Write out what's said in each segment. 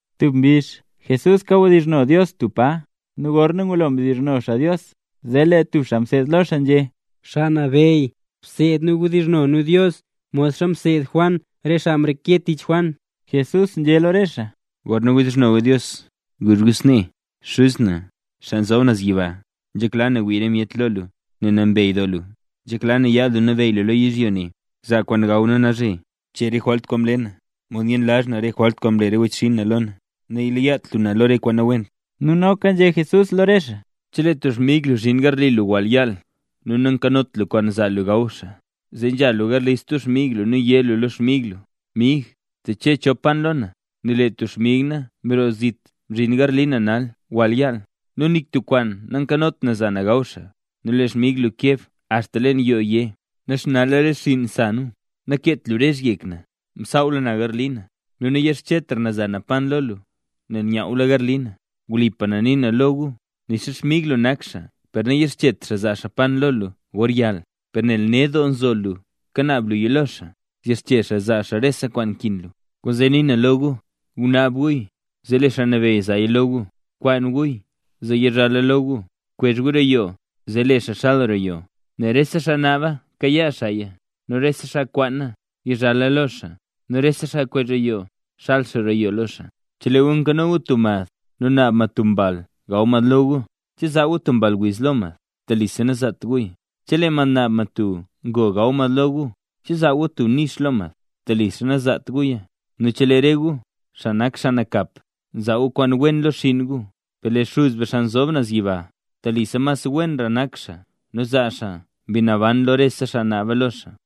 Tub mbizh Jesús kawdizhno Dios tub pa. Nu gorna ngulo mdizhno xaa Dios, zee lee tub xaa mseed lo xaa nzhé: —Xaa Nabeyy, bseed nu wdizhno nu Dios, modxa mseed Juan re xaa mreke tich Juan. Jesús nzhé lo re xaa: —Gorna wdizhno gu Dios guzh gu snee: Xuz na, xaa nzob naz yiba, nzhekla na wii re myet lo lu, nel nambey doo lu. Nzhekla na yaad lu nabeyy lu lo yizhyo ne. Zaa kwaan gaw na nalzhe. Bchee rese jwalt kwaan mle na, modxa myenlazh na re jwalt kwaan mle wechxinn na lo na. Naleyat lu na la na lo re kwaan nawent. Nu noka nzhé Jesús lo re xaa: —Chelee tub xmig lu mzhin garli lu wall yaal, nu nakanot lu kwaan zaa lu gaw xaa, zee nzha lu garli stub xmig lu nu yé lu lo xmig lu: “Mig, teche chon pan lo na, nel lee tub xmig na mroo zit mzhin garli na nal yaal, nu nik tub kwaan nankanot na za na gaw xaa”. Nu lee xmig lu keb axta leen yoo, yé: “Naxnala re xiin sa nu, nakeet lu rezh yek na. Msaawla na garli na, nu nayixchetra na za na pan lo lu, nel nyawwla garli na.” Wlipa na nii na lo gu, nixa xmig lu nak xaa per nayixchet xaa zaa xaa pan lo lu gor yaal, per nel ned doo nzo lu kanaab luya lo xaa, yixche xaa zaa xaa rese kwaan kin lu. Kwaanzee nii na lo gu: Gunaab guya, zee lee Xaa Nabeyy zaaya lo gu; bkwaan guya, zee yizhala lo gu; bkwezh gu roo yoo, zee lee xaa xal roo yoo. Nel rese xaa naaba kayaa xaaya; nu rese xaa nkwaana, yizhala lo xaa; nu rese xaa kwezh roo yoo, zxal xaa roo yoo lo xaa. ’Chelee gu nkano gu tub mad nu naab mad tub mbal gaw mad lo gu, ¿che zaa gu tub mball wiz lo mad? Telisa nazaat guya. Nu chelee mad naab mad tub ngo gaw mad lo gu, ¿che zaa gu tub nix lo mad? Telisa nazaat guya. Nu chelee re gu, xaa nak xaa nakap, nzaa gu kwaan wen lo xinn gu, ¡per lee Xuz be xaa nzob naz yiba, telisa mas wenra nak xaa nu zaa xaa Mbi Naban lo rese xaa naaba lo xaa!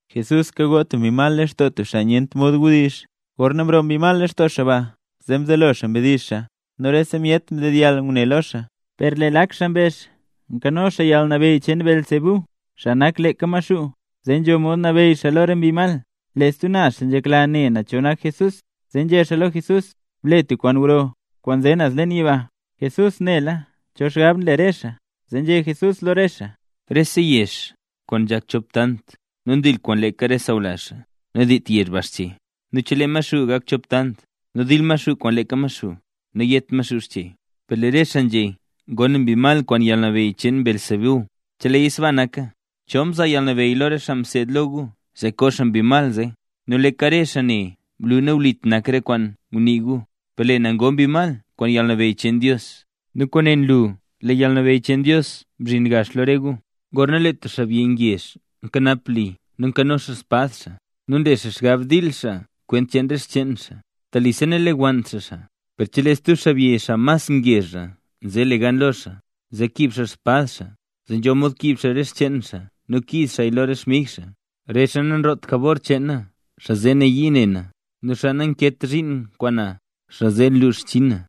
Jesús kagoo tub mbi mal lextoo tub xaa nyent mod wdizh. Gorna mroo mbi mal lextoo xaa ba, zee mzelo xaa mdizh xaa nu rese myet mdedyall ngune lo xaa. Per lee lak xaa mbezh: —Nkano xaa yalnabeyy cheen Beelzebú, xaa nak leeka Maxuu, zee nzho mod nabeyy xaa lo re mbi mal. Lee stub naz xaa nzhekla ne cho nak Jesús, zee nzhé xaa lo Jesús: —Ble tub kwaan gro, kwaan nze naz leen yiba. Jesús nela cho xgab nle re xaa, zee nzhé Jesús lo re xaa: —Rese yezh, kwaan nzhak chop tant nu ndil kwaan leeka re sawlazh xaa, nadiit yezh ba xche. Nu chelee Maxuu gak chop tant, nu dil Maxuu kwaan leeka Maxuu, nayet Maxuu xche. Per lee re xaa nzhé ngoo na mbi mal kwaan yalnabeyy cheen Beelzebú. Cheleeya sbaa naka, ¿cho mzaa yalnabeyy lo re xaa mseed lo gu zee koo xaa mbi mal zee? Nu leeka re xaa ne nlu nawlit nak re kwaan ngunii gu. Per lee na ngoo mbi mal kwaan yalnabeyy cheen Dios, nu kwaane nlu lee yalnabeyy cheen Dios mzhinla lo re gu. ’Gorna lee tub xaabyi ngezh nkanap li nu nkano xaa xspad xaa, nu nle xaa xgab dil xaa kwent cheen re xcheen xaa, telisa nalewannt xaa xaa. Per chelee stub xaabyi xaa mas ngezhra nze le gan lo xaa, zee kiib xaa xspad xaa, zee nzho mod kiib xaa re xcheen xaa nu kiiz xaaya lo re xmig xaa. ’Re xaa nanroot jabor cheen na, xaa zee nayii ne na; nu xaa nankeet zhiin kwaan na, xaa zee nluux xchinn na.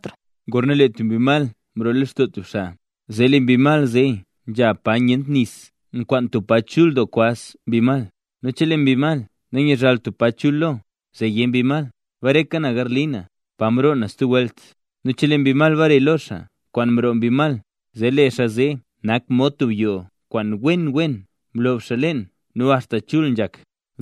’Gorna lee tub mbi mal mroo lextoo tub xaa, zee lee mbi mal zee nzha pa nyent nis nkwaan tub pa chul doo kwaz mbi mal. Nu chelee mbi mal nanyazhaalt tub pa chul lo, zee yé mbi mal: “Bareka na garli na, pa mroo na stub welt”. Nu chelee mbi mal bare lo xaa kwaan mroo mbi mal, zee lee xaa zee nak mod tub yoo kwaan wen wen mlob leen nu axta chul nzhak.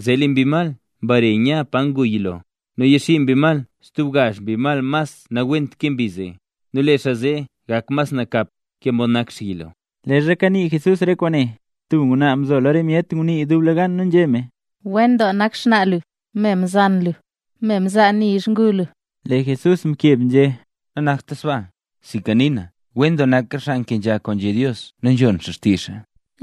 Zee lee mbi mal mbare nya pa ngu yilo, nu yaxii mbi mal stub gazh mbi mas nawent ke mbi zee. Nu lee xaa ne gak mas nakapra ke mod nak xaa yilo. Leezha kanii Jesús re kwaane, tub ngwnaa mzo lo re myet ngunii dublegan nu nzhé me: —¡Wen doo nak xnaa lu, me mzan lu nu me mzaa nizh ngu lu! Lee Jesús mkeb nzhé: —Nanakta sbaa mod ngunii lu, sinka nii na lo lu: ¡Wen doo nak re xaa nkenzha kwaan nzhé Dios, nu nzhon xaa xtizh xaa!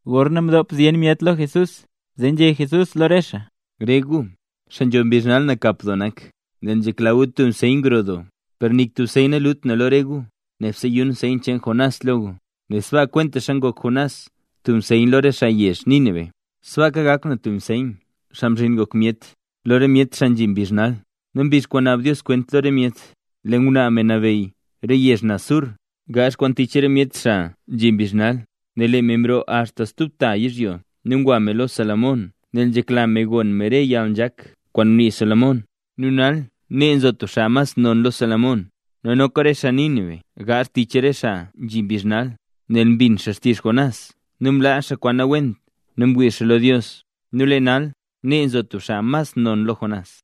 Gorna mdop zyen myet lo Jesús, zee nzhé Jesús lo re xaa: —Rese gu, xaa nzho mbizh nal nakap doo nak, nel nzhekla gu tub nseyn gro doo, per nik tub nseyn nalut na lo re gu, nebse yun nseyn cheen Jonás lo gu. Nel sbaa kwentaxa ngok Jonás tub nseyn lo re xaa yezh Nínive, sbaaka gak na tub nseyn, Xaa Mzhin Ngok Myet, lo re myet xaa nzhi mbizh nal. Nu mbizh kwaan naab Dios kwent lo re myet, lee ngwnaa me mnabeyy Re Yezh Naz Sur, gaazh kwaan tich re myet xaa nzhi mbizh nal, nel lee me mroo axta stub ta yizhyo nu ngwa me lo Salomón nel nzhekla me gon me re yalnzhak kwaan ngunii Salomón. Nu nal nee nzo tub xaa mas nonra lo Salomón. Nu noka re xaa Nínive gaazh kwaan tich re xaa nzhi mbizh nal, nel mbin xaa xtizh Jonás nu mlaa xaa kwaan nawent nu mwii xaa lo Dios. Nu lee nal nee nzo tub xaa mas non lo Jonás.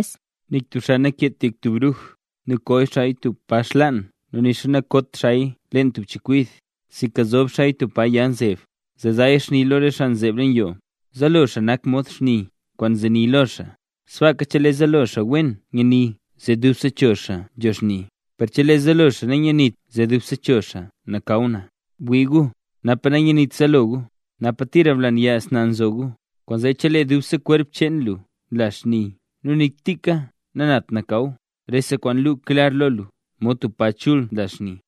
’Nik tub xaa nakeet yek tub bruj, nu ko xaaya tub pa xlaan nu nixa nakot xaaya leen tub chekwid, sinka nzob xaaya tub pa ya nzeb zee zaaya xni lo re xaa nzeeb leen yoo. Zaalo xaa nak mod xni kwaan nzeni lo xaa. Sbaaka chelee zaalo xaa wen nyani zee dubse cho xaa nzho xni. Per chelee zaalo xaa nanyenit zee dubse cho xaa nakaw na. Bwii gu, napa nanyenit zaalo gu, napa tira blanyas na nzo gu. Kwaanzee chelee dubse kwerp cheen lu nla xni nu nik tika nanat nakaw, rese kwaan luu klar lo lu mod tub pa chul nla xni.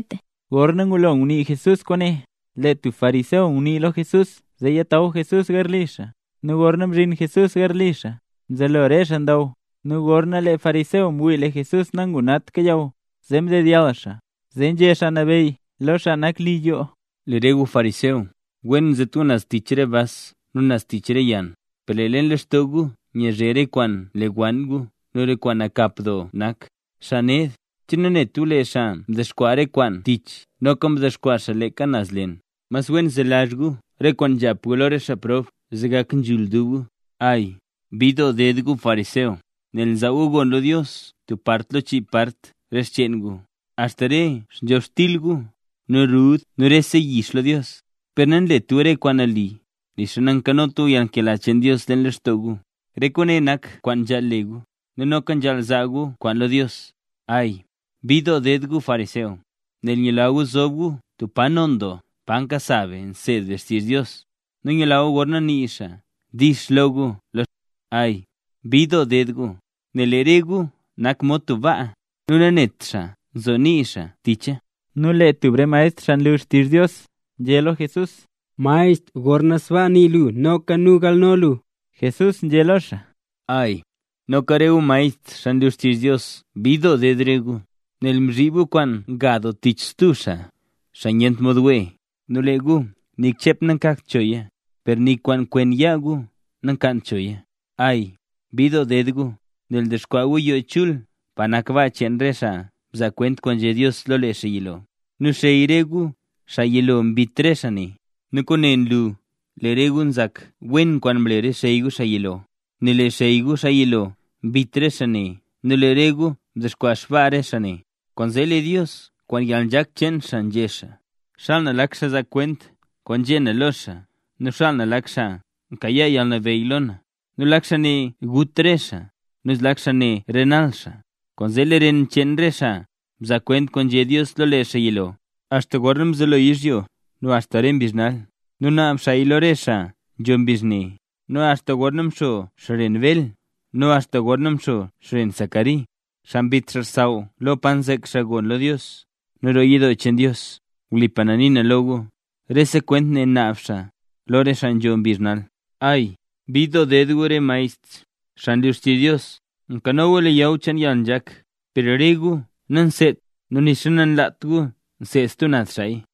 Gorna ngulo ngunii Jesús kwaane, lee tub xaa fariseo ngunii lo Jesús zee yataw Jesús garli xaa. Nu gorna mzhin Jesús garli xaa, mzelo re xaa ndaw. Nu gorna lee fariseo mwii lee Jesús nangunagt kayaw, zee mdeyall xaa. Zee nzhé Xaa Nabeyy lo xaa nak li yoo: —Lee re gu fariseo, wen nzet gu naz tich re bas nu naz tich re yann, per lee leen lextoo gu nyazhe re kwaan mlewann gu nu re kwaan nakap doo nak. ¡Xaa ned! ¿Che nanet gu lee xaa kwaan mdexkwaa kwaan naz tich noka mdexkwaa leeka kwaan naz leen? Mas wen zelazh gu re kwaan nzhap gu lo re xaa prob zee gak nzhul dub gu. ’¡Ay, bid doo ded gu fariseo! Nel nzaa gu gon lo Dios tub part lo chii part re xcheen gu, axta re btyonxtil, nu rud nu rese yix lo Dios, per nanlet gu re kwaan nali nixa nankanot gu yalnkela cheen Dios leen lextoo gu. Re kwaane nak kwaan nzhaal le gu, nu noka nzhaal nzaa gu kwaan lo Dios. ’¡Ay, bid doo ded gu fariseo! Nel nyula gu zob gu tub pa non doo pa nkasa be nseed be xtizh Dios, nu nyula gu gorna nii xaa “dix” lo gu lo xbi. ’¡Ay, bid doo ded gu! Nel lee re gu nak mod tub baa, nu nanet xaa nzo nii xaa ticha. Nu lee tub re maestr xaa nlu xtizh Dios nzhé lo Jesús: —¡Maestr, gorna sbaa nii lu, noka nu ngalno lu! Jesús nzhé lo xaa: —¡Ay, noka re gu maestr, xaa nlu xtizh Dios bid doo ded re gu! Nel nzhib gu kwaan nga doo tich stub xaa, xaa nyent mod wee. Nu lee gu nik chep nakagt choya, per nik kwaan kwen yaa gu nakaant choya. ’¡Ay, bid doo ded gu! Nel ndexkwaa gu yoo chul pa nak baa cheen re xaa mzaa kwent kwaan nzhé Dios lo lee xaa yilo, nu xey re gu xaa yilo mbit re xaa ne. Nu kwaane nlu lee re gu nzak wen kwaan mle re xey gu xaa yilo, nel lee xey gu xaa yilo mbit re xaa ne nu lee re gu ndexkwaa xbaa re xaa ne. ’Kwaanzee lee Dios kwaan yalnzhak cheen xaa nzhé xaa: “Xaal na lak xaa zaa kwent kwaan nzhé na lo xaa nu xaal na lak xaa nkayaa yalnabeyy lo na; nu lak xaa ne gut re xaa nu zlak xaa ne renal re xaa”. Kwaanzee lee ren cheen re xaa mzaa kwent kwaan nzhé Dios lo lee xaa yilo, axta gorna mzelo yizhyo nu axta re mbizh nal, nu naab xaaya lo re xaa nzho mbizh ne; nu axta gorna mxo xren Bel nu axta gorna mxo xren Zacari, xaa mbit xaa xsaww lo pa nzek xaa gon lo Dios nu roo yidoo cheen Dios. Wlipa na nii na lo gu, rese kwent ne naab xaa lo re xaa nzho mbizh nal. ’¡Ay, bid doo ded re gu maestr, xaa nlu xtizh Dios! Nkano gu leyaw cheen yalnzhak, per re gu nanseedt nu nixa nanlaat gu seed stub naz xaaya.